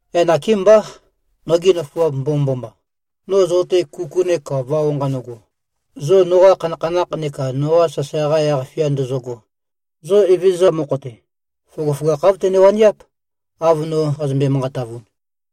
Yaq nakémbá, nogi nøfuap mbomømboma, no zo-te kuku neka vao nqanøgo, zo noqa khanakhanakh neka noqa sasae-qa yaq-fia ndozogo; zo Evezøza mokho-te, føgøføgakh āv tøne-waniáp, av no qazømbe-manqatavun.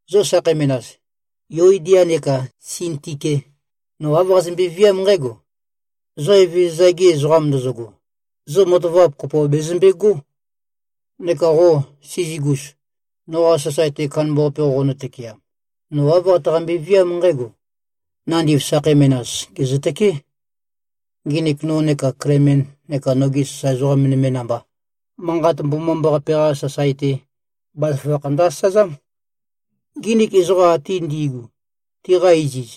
Zo sakhei menas, Yuodia neka Sintike, no āv qazømbe-viám nqǽgo: Zo Evezøza-gi ezoqam ndozogo, zo matavap kopo bezømbegó. Neka qo, Sizigus, noqa sasae-te kandambaqape qoqonø-tøkeam, no āv qataqambe-viám nqǽgo: Nandiv sakhei menas gèzøtøké. Nginik no neka Klemen neka nogi sasae ezoqa nøme namba, Manqat Mbomambaqape-qa sasae-te, bazaføgakh ndø-asazám. Nginik ezoqa ate ngi꞉gu, tiqa iziz,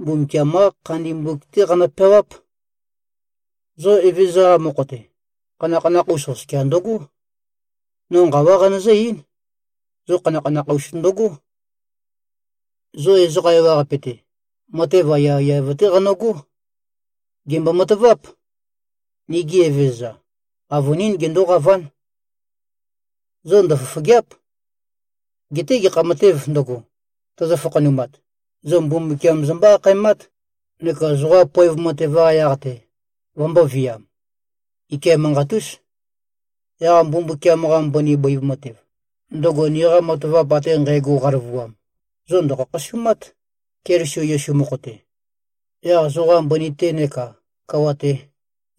Mbumbukiam-qá khandi mbuk-té qanø-peawáp. Zo Evezøza-qa mokho-te, khanakhanakh-us oskia ndøgó. No nqawá qanøzǿ-eín: Zo khanakhanakh-us ndøgó! Zo ezoqa ewaqape-te, matev aiyaiyav-té qanøgó. Gèmbo-mataváp: Nigi Evezøza, avønín gendóqaván. Zo ndøfofògea᷄p. Geté gekha matēv ndøgo, tøzø-fakhanumat, zo Mbumbukiam zombó-akhaemát, neka zoqa poev matev-qa yaq-te vømbōviam. Ike manqat-ús. Yaq Mbumbukiam-qa mbøni bøiv matev, ndøgo niqa matavap ate nqægo qaløvuam, zo ndø̀khakhasumát, Keliso Yesu mokho-te. Yaq zoqa mbøni-te neka kawa-te,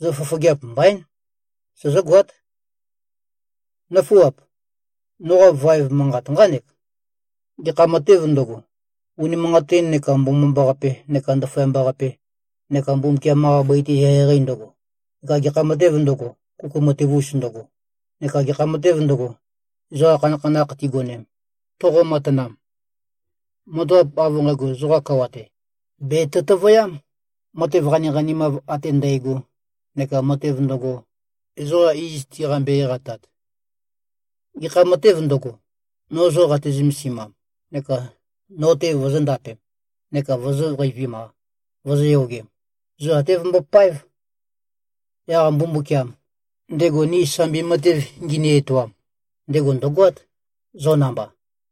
zo fofogeap mbaín. Sozógoát. Nǿfuap! Noqa vaev manqat nqánek: Gekha matēv ndøgo, unimanqatin neka mbomambaqape neka ndaføyamba-qape neka Mbumbukiam-qa bøi-te eqeieqei ndøgo, neka gekha matēv ndøgo, kuku matev-us ndøgo, neka gekha matēv ndøgo, ezoqa khanakhanakh tigonem, toqo-matanam; matavap av nqægo zoqa kawa-te, bètø-tøvøyám, matev qaniqanimav ate ndægo neka matev ndøgo, ezoqa iz tiqambe-eqatat. Gekha matev ndø̄go, no zo qate-zømesimam, neka no-te vozōndapem, neka vozōqeivim-a, vozōyogem, zo até vømbopáev. Yaq Mbumbukiam, ndego ni sambi matev ngini-etoam, ndego ndø̀goát, zo namba.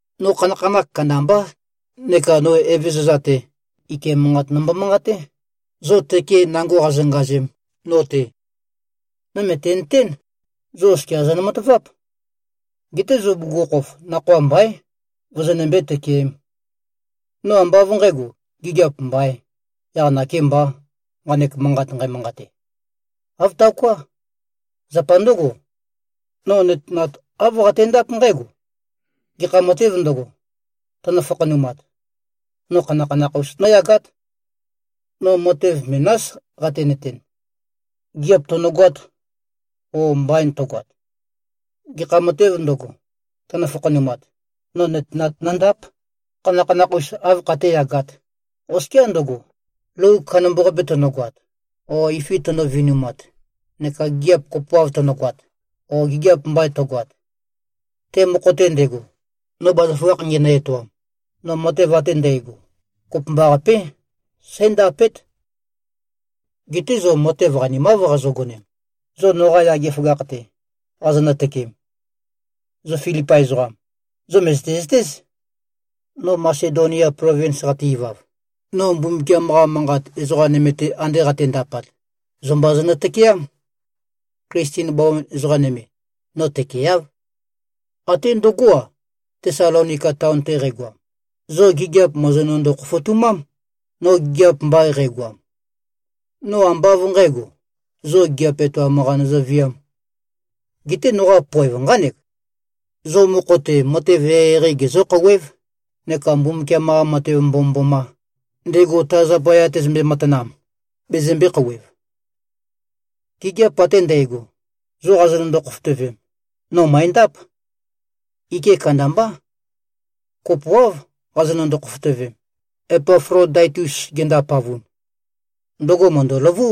No khanakhanakh kandambá neka no Evezøza-te, ike manqat nombo-manqaté, zo tøke nango qazongazem, no-te. No mø̀tenøtén, zo oskia zonø-mataváp. Geté zo bugukhokhof, nakhoa mbaín, vozonømbé-tøkeēm. No ambá av nqǣgo, gigiap mbaīn, yaq nakēmbā, nqanek manqat nqæmanqate. Āv taoká. Zapa ndǿgo, no nøtenat āv qatendáp nqǽgo: Gekha matēv ndøgo, tønø-fakhanumat, no khanakhanakh-us nǿyagát. No matev menás qatenøten: Gigiap tønø̀goāt, ō, mbain tøgoat. Gekha matēv ndøgo, tønø-fakhanumat, no nøtenat nøndáp, khanakhanakh-us āv khatéyagāt, oskiá ndøgo, lou kandambaqape tønøgoat, o ifi tønø-vinumat, neka gigiap kopoav tønøgoat, o gigiap mbain tøgoat. Te mokho-te ndego, no bazaføgakh ngenø-etoam, no matev ate ndægo, kopømbaqapé, sǽndapét. Geté zo matev qanimáv qazogonem, zo noqa yage føgakh-te, qazonø-tøkeem. Zo Filipai ezoqam, zo mø̀zøte-zøtéz. No Masedonia plovins qate-ivav, no Mbumbukiam-qa Manqat ezoqa nøme-te ande qatendapat, zo mba zonø-tøkeám. Klisten bawan ezoqa nøme, no tøkeeáv. Até ndøgó-a, Tesalonika taon-te qægoam, zo gigiap mòzonøndo-khofotumám, no gigiap mbain qægoam. No ambá av nqǣgo, zo gigiap etoam-qa nøzøviām. Geté noqa poev nqánek: Zo mokho-te matev eqeieqei gezǿ-khouwév, neka Mbumbukiam-qa matev mbomømboma, ndego ta zapaya tezømbe-matanam, bezømbē-khouwev. Gigiap ate ndægo, zo qazonøndo-khofotøvem, no mø̀endáp. Ike kandambá. Kopoáv qazønøndo-khofotøvem, Epaflodaitus gendapavun. Ndøgo mø̀ndøløvú,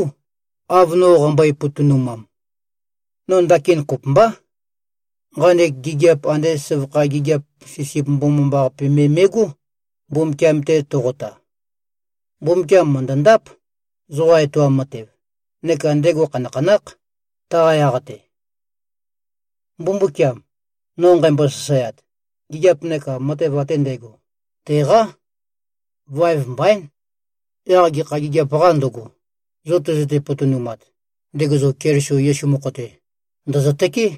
av no qambøe-potonumam. No ndakin kopømbá. Nqanek gigiap ande søvakha gigiap sisip mbomambaqape me me꞉gó, Mbumbukiam-te toqota. Mbumbukiam mø̀ndøndáp, zoqa etoam matev, neka ndego khanakhanákh, taqa yaq-te. Mbumbukiam, no nqæmbo-sasaeat, gigiap neka matev ate ndægo, teqá. Vaev mbaín. Yaq gekha gigiap-qā ndøgo, zo tøzøte-potonumat, ndego zo Keliso Yesu mokho-te, ndø̀zøtøké.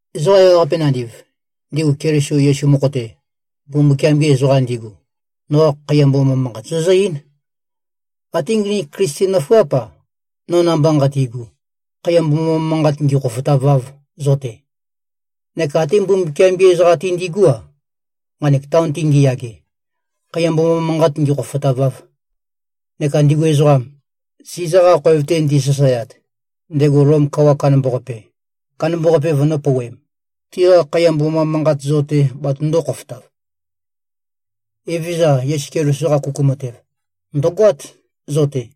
Ezoqa ewaqape nandiv, ndigu Keliso Yesu mokho-te, Mbumbukiam-gi ezoqam ndigu, noqa khaiya mboma manqat zozǿ-eín. Até nginik Klisten nøfuáp-a, no namba nqatigu, khaiya mboma manqat ngīkhōfōtāvāv, zo-te. Neka até Mbumbukiam-gi ezoqam ate ngi꞉gú-a, nqanek taon-te ngiyage, khaiya mboma manqat ngīkhōfōtāvāv. Neka ndigu ezoqam, Siza-qa khoev-te ndisasaeat, ndego Lom kawa kandambaqape, kandambaqape vønø̄pouwem, tiqa khaiya mboma manqat zo-te batøndō-khofotav. Evezøza Yesu Keliso-qa kuku matev, ndø̀goát zo-te.